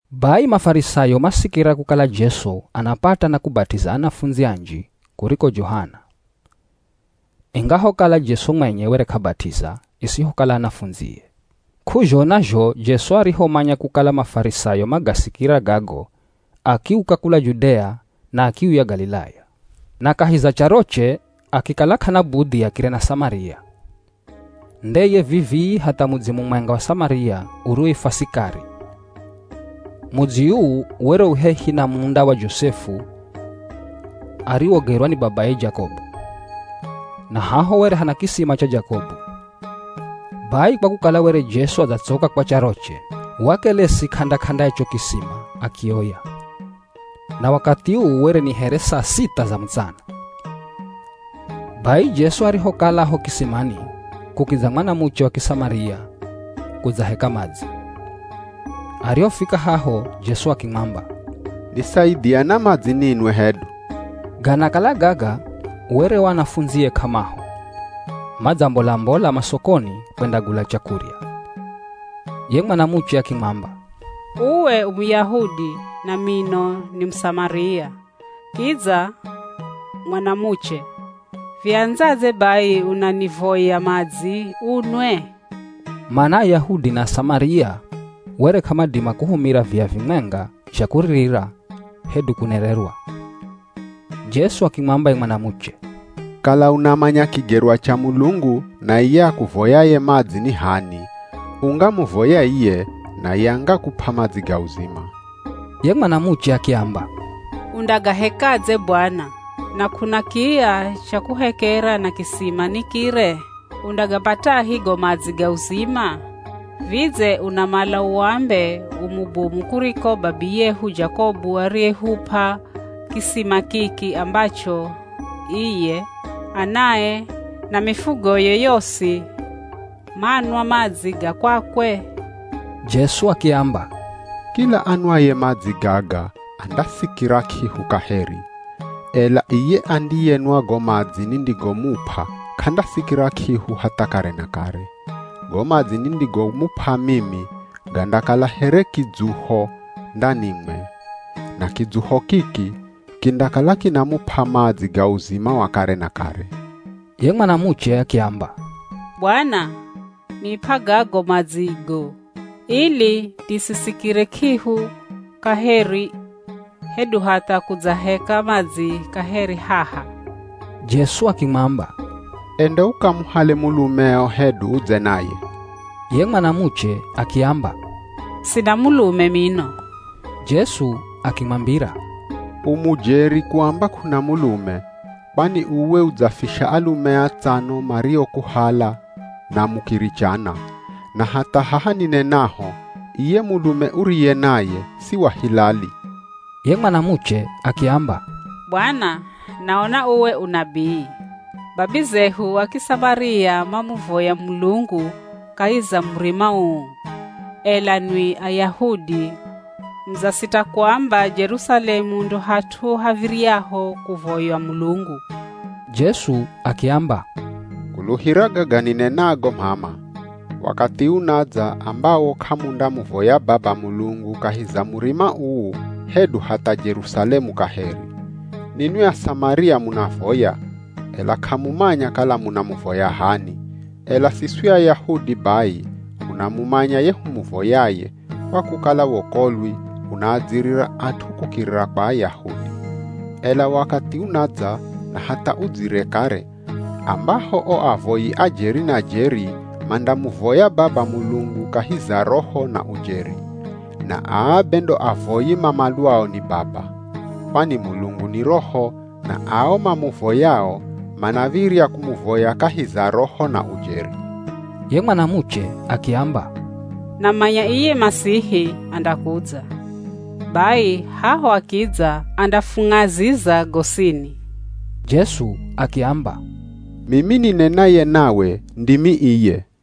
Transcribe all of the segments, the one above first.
Bai Mafarisayo masikira kukala Jesu anapata na kubat'iza anafundzi anji kuriko Johana. (Ingahokala Jesu mwenye were k'abat'iza, isihokala anafundzie.) K'uzhona zho Jesu arihomanya kukala Mafarisayo magasikira gago, akiuka kula Judea na akiuya Galilaya. Na kahi za charoche akikala k'ana budhi akire na Samaria. Ndeye vivi hatha mudzi mumwenga wa Samaria uriwoifwa Sikari. Mudzi uu were u hehi na munda wa Josefu ariwogerwa ni babaye Jakobu. Na haho were hana kisima cha Jakobu, bai kwa kukala were Jesu adzatsoka kwa charoche, wakelesi k'anda-k'anda ya cho kisima akioya. Na wakathi uu were ni here saa sitha za mutsana. Bai Jesu arihokala a ho kisimani, kukidza mwanamuche wa Kisamaria kudzaheka madzi. Arihofika haho Jesu akimwamba, “Nisaidhia na madzi ninwe hedu.” Ganakala gaga were o anafundzie k'amaho, madzambola-mbola masokoni kwendagula chakurya. Ye mwanamuche akimwamba, “Uwe u Muyahudi na mino ni Musamaria, kidza mwanamuche, viandzadze bai unanivoya madzi unwe?” (Mana Ayahudi na Asamaria were k'amadima kuhumira viya vimwenga zha kuririra hedu kunererwa.) Jesu akimwamba ye mwanamuche, “Kala unamanya kigerwa cha Mulungu na iye akuvoyaye madzi ni h'ani, ungamuvoya iye naye angakup'a madzi ga uzima.” Ye mwanamuche akiamba, “Undagahekadze Bwana, na k'una kiya cha kuhekera na kisima ni kire. Undagapatahi go madzi ga uzima? Vidze unamala uambe u mubomu kuriko babiyehu Jakobu ariyehup'a kisima kiki ambacho iye, anae, na mifugoye yosi manwa madzi ga kwakwe?” Jesu akiamba, “Kila anwaye madzi gaga andasikira k'ihu kaheri, ela iye andiyenwa go madzi nindigomup'a k'andasikira k'ihu hatha kare na kare. Go madzi nindigomup'a mimi gandakala here kidzuho ndanimwe, na kidzuho kiki kindakala kinamup'a madzi ga uzima wa kare na kare.” Ye mwanamuche akiamba, “Bwana, nip'a gago madzigo, ili nisisikire k'ihu kaheri, hedu hatha kudzaheka madzi kaheri haha.” Jesu akimwamba, “Enda ukamuhale mulumeo hedu udze naye.” Ye mwanamuche akiamba, “Sina mulume mino.” Jesu akimwambira, “U mujeri kuamba k'una mulume. Kwani uwe udzafisha alume atsano mariokuhala na mukirichana, na hatha haha ninenaho, iye mulume uriye naye si wa hilali.” Ye mwanamuche akiamba, “Bwana, naona uwe u nabii! Babizehu a Kisamaria mamuvoya Mulungu kahi za murima uu, ela nwi Ayahudi mudzasita kuamba Jerusalemu ndo hat'u hav̱iryaho kuvoywa Mulungu.” Jesu akiamba, “Kuluhira gaga ninenago m'ama, wakathi unadza ambawo k'amundamuvoya Baba Mulungu kahi za murima uu hedu hatha Jerusalemu kaheri. Ninwi Asamaria munavoya, ela k'amumanya kala munamuvoya h'ani, ela siswi Ayahudi bai hunamumanya ye humuvoyaye, kwa kukala wokolwi unaadzirira at'u kukirira kwa Ayahudi. Ela wakathi unadza na hatha udzire kare ambaho o avoyi a jeri na jeri mandamuvoya Baba Mulungu kahi za Roho na ujeri. Na aa be ndo avoyi mamalwao ni Baba. Kwani Mulungu ni roho na ao mamuvoyao manav̱irya kumuvoya kahi za Roho na ujeri.” Ye mwanamuche akiamba, “Namanya iye Masihi andakudza, bai haho akidza andafung'aziza gosini.” Jesu akiamba, “Mimi ninenaye nawe, ndimi iye.”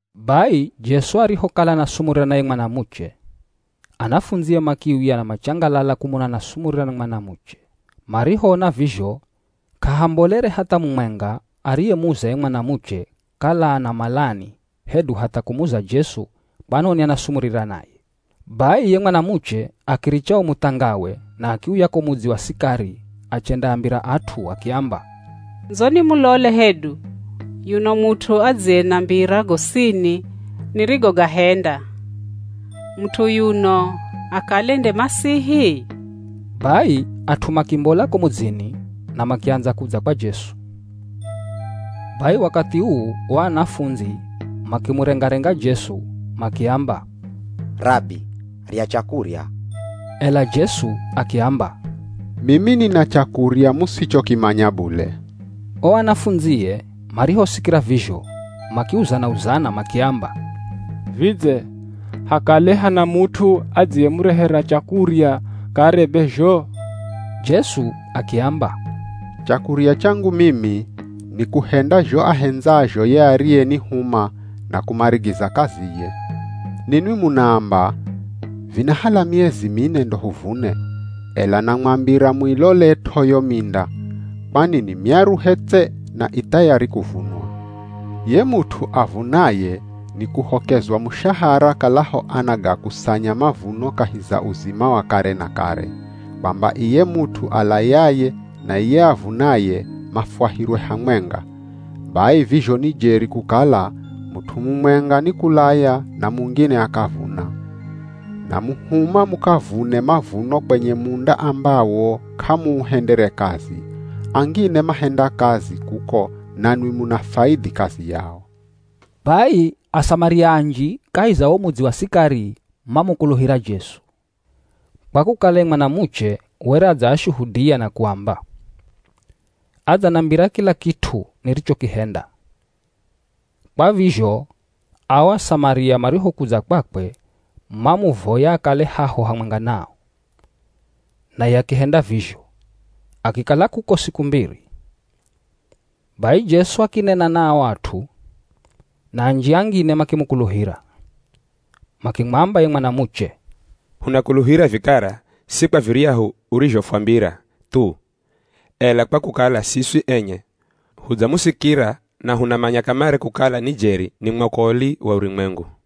Bai Jesu arihokala anasumurira na ye mwanamuche, anafundzie makiuya na machangalala kumona anasumurira na mwanamuche. Marihoona vizho, k'ahambolere hatha mumwenga ariyemuza ye mwanamuche kala anamalani hedu hatha kumuza Jesu kwanoni anasumurira naye. Bai ye mwanamuche akiricha wo muthangawe na akiuya ko mudzi wa Sikari achendaambira at'u akiamba, “Ndzoni mulole hedu yuno mut'u adziyenambira gosini nirigogahenda. Mut'u yuno akale nde Masihi?” Bai at'u makimbola ko mudzini na makiandza kudza kwa Jesu. Bai wakathi uu o anafundzi makimurenga-renga Jesu makiamba, “Rabi, rya chakurya.” Ela Jesu akiamba, “Mimi nina chakurya musichokimanya bule.” O anafundzie marihosikira vizho makiuzana-uzana makiamba, “Vidze hakale hana mut'u adziyemurehera chakurya kare be zho?” Jesu akiamba, “Chakurya changu mimi ni kuhenda zho ahendzazho ye ariyenihuma na kumarigiza kaziye. Ninwi munaamba, ‘Vinahala miezi mine ndo huvune.’ Ela namwambira muilolet'o yo minda, kwani ni myaruhe tse na i thayari kuvunwa. Ye mut'u avunaye nikuhokezwa mushahara kalaho anagakusanya mavuno kahi za uzima wa kare na kare, kwamba iye mut'u alayaye na iye avunaye mafwahirwe hamwenga. Bai vizho ni jeri kukala ‘mut'u mumwenga ni kulaya na mungine akavuna.’ Namuhuma mukavune mavuno kwenye munda ambawo k'amuuhendere kazi, angine mahenda kazi kuko nanwi munafaidhi kazi yao.” Bai Asamaria anji kahi za wo mudzi wa Sikari mamukuluhira Jesu, kwa kukala ye mwanamuche were adzaashuhudia na kuamba, “Adzanambira kila kit'u nirichokihenda!” Kwa vizho ao Asamaria marihokudza kwakwe mamuvoya akale haho hamwenga nao, naye akihenda vizho, akikala kuko siku mbiri. Bai Jesu akinena na o at'u, na anji angine makimukuluhira. Makimwamba ye mwanamuche, “Hunakuluhira vikara, si kwa viryahu urizhofwambira thu, ela kwa kukala siswi enye hudzamusikira na hunamanya kamare kukala ni jeri ni mwokoli wa urumwengu.”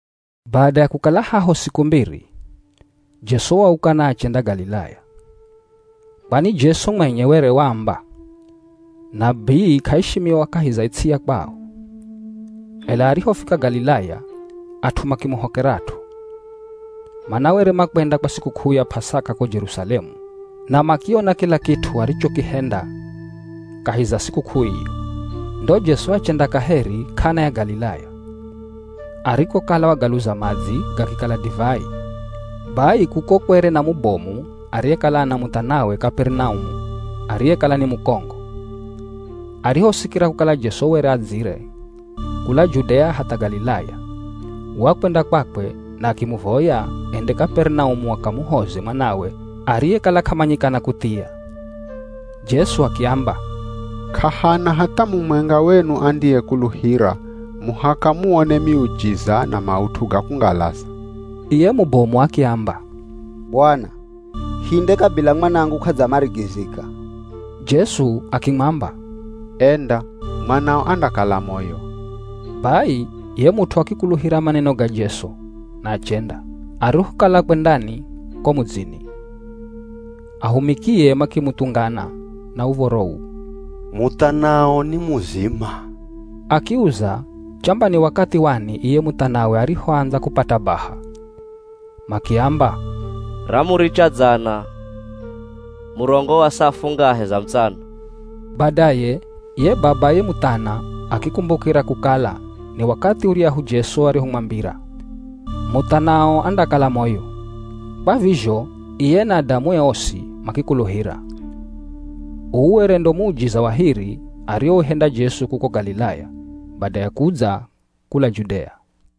Bada ya kukala haho siku mbiri, Jesu wauka na achenda Galilaya. Kwani Jesu mwenye were waamba, “Nabii k'aishimiwa kahi za ts'i ya kwao.” Ela arihofika Galilaya at'u makimuhokerat'o, mana were makwenda kwa sikuk'uu ya P'asaka ko Jerusalemu na makiona kila kit'u arichokihenda kahi za sikuk'uu iyo. Ndo Jesu achenda kaheri K'ana ya Galilaya, arikokala wagaluza madzi gakikala divai. Bai kuko kwere na mubomu ariyekala ana muthanawe Kaperinaumu ariyekala ni mukongo. Arihosikira kukala Jesu were adzire kula Judea hatha Galilaya, wakwenda kwakwe na akimuvoya ende Kaperinaumu akamuhoze mwanawe ariyekala k'amanyikana kuthia. Jesu akiamba, “K'ahana hatha mumwenga wenu andiyekuluhira muhaka muone miujiza na maut'u ga kungalaza.” Iye mubomu akiamba, “Bwana, hinde kabila mwanangu k'adzamarigizika.” Jesu akimwamba, “Enda, mwanao andakala moyo!” Bai ye mut'u akikuluhira maneno ga Jesu na achenda. Arihokala akwendani ko mudzini, ahumikie makimuthungana na uv̱oro uu, “Muthanao ni muzima!” Akiuza chamba ni wakathi wani iye muthanawe arihoandza kupata baha. Makiamba, “Ramuricha dzana, murongo wa saa fungahe za mutsana.” Badaye ye babaye muthana akikumbukira kukala ni wakathi uryahu Jesu arihomwambira, “Muthanao andakala moyo.” Kwa vizho iye na adamue osi makikuluhira. Uu were ndo muujiza wa hiri ariouhenda Jesu kuko Galilaya bada ya kudza kula Judea.